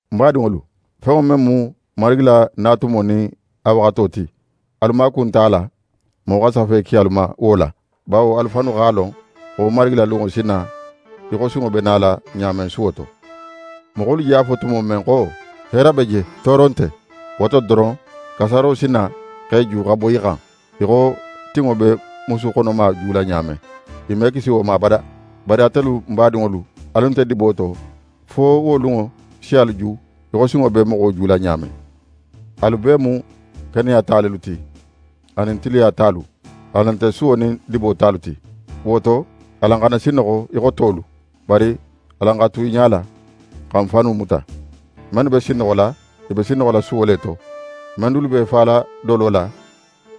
N badinŋolu, fenŋo men mu Marigi la na tumo nin a waxato ti, alu maaku nte a la moxo xa safe ki alu ma wo la. Bawo alu fannu x'a lon xo Marigi la lunŋo si na í xo sunŋo be nala ɲa men suwo to. Moxolu je a fo tumo men xo: «Heera be je, tooro nte!», wo to doron, kasaaro si na x'e ju xa boyi i xan, í xo tinŋo be musu xonoma jula ɲa men. I me kisi wo ma abada. Bari atelu n badinŋolu, alu nte dibo to, fo wo lunŋo si alu ju í xo sunŋo be moxo jula ɲa men. Alu bee mu keneya ta lelu ti, anin tiliya talu. Alan nte suwo nin dibo talu ti. Wo to, alan xana sinnoxo í xo tolu, bari alan xa tu i ɲala, xa n fannu muta. Mennu be sinnoxola, i be sinnoxola suwo le to; men dulu b'e fala dolo la,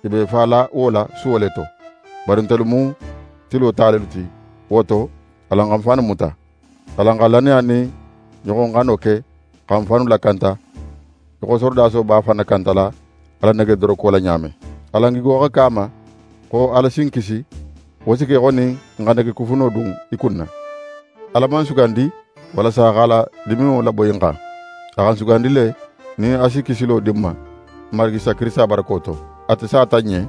i b'e fala wo la suwo le to. Bari ntelu mu tilo ta lelu ti; wo to, alan xa n fannu muta. Alan xa lannaya nin ɲoxoxano ke xa n fannu lakanta, í xo sorodaso b'a fan nakantala a la negedoroko la ɲa men. Alan gigo xa ke a ma xo Ala si n kisi, wo si ke í xo nin n xa negekufuno dun í kunna. Ala man n sugandi walasa a x'a la diminŋo laboyi n xan; a xa n sugandi le, nin a si kisilo di n ma, n Marigi Isa Kirisita barako to. Ate sata n ɲen,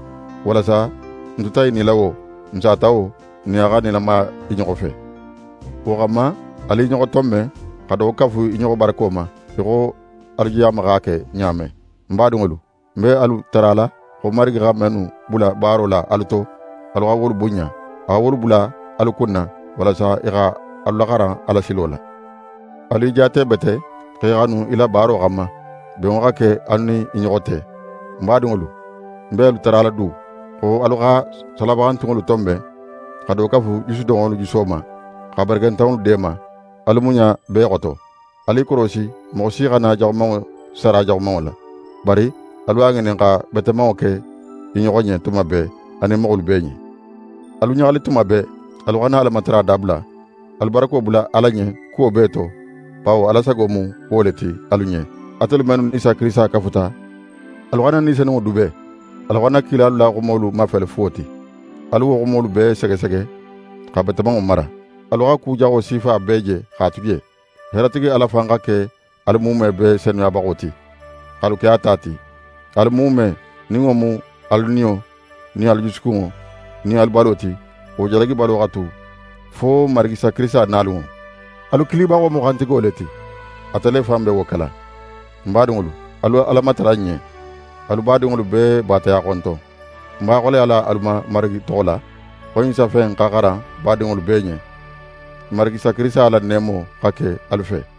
walasa n tuta i nila wo, n sata wo, n nin a xa nilamaya i ɲoxo fe. Wo xanma, alu i ɲoxo tonben, xa do kafu i ɲoxo barako ma, í xo alu je a ma x'a ke ɲa men. N badinŋolu, n be alu tarala xo Marigi xa mennu bula baaro la alu to, alu xa wolu bunɲa. A xa wolu bula alu kunna, walasa i xa alu laxaran a la silo la. Alu i jaate bete, x'e xanu i la baaro xanma. Benŋo xa ke alu nin i ɲoxo te. N badinŋolu, n be alu tarala du, xo alu xa salabaxantunŋolu tonben, xa do kafu jusudoxonŋolu juso ma, xa barakentanŋolu deema. Alu muɲa bee xoto. Alu i korosi, moxo si xana jaxumanŋo sara jaxumanŋo la, bari alu a ŋinin xa betemanŋo ke i ɲoxo ɲen tuma bee, anin moxolu bee ɲen. Alu ɲaxali tuma bee. Alu xana Alamatara dabula. Alu barako bula Ala ɲen kuwo bee to, bawo Ala sago mu wo le ti alu ɲen, atelu mennu nin Isa Kirisita kafuta. Alu xana Ni Senunŋo dube. Alu xana kilalu la xumolu mafele fuwo ti. Alu wo xumolu bee segesege, xa betemanŋo mara. Alu xa ku jaxo sifa bee je x'a tu je. Heeratigi Ala fan xa ke alu muume bee senuyabaxo ti, x'alu ke a ta ti. Alu muume, nin wo mu alu niyo nin alu jusukunŋo nin alu balo ti, wo jalagibalo xa tu fo Marigi Isa Kirisita nalunŋo. Alu kilibaxo mu xantigo le ti, ate le fan be wo kela. N badinŋolu, alu Ala matara n ɲen. Alu badinŋolu bee baataya xonton. Ń b'a xoleyala alu ma Marigi toxo la, xo ɲin safe in xa xaran badinŋolu bee ɲen. N Marigi Isa Kirisita la neemo xa ke alu fe.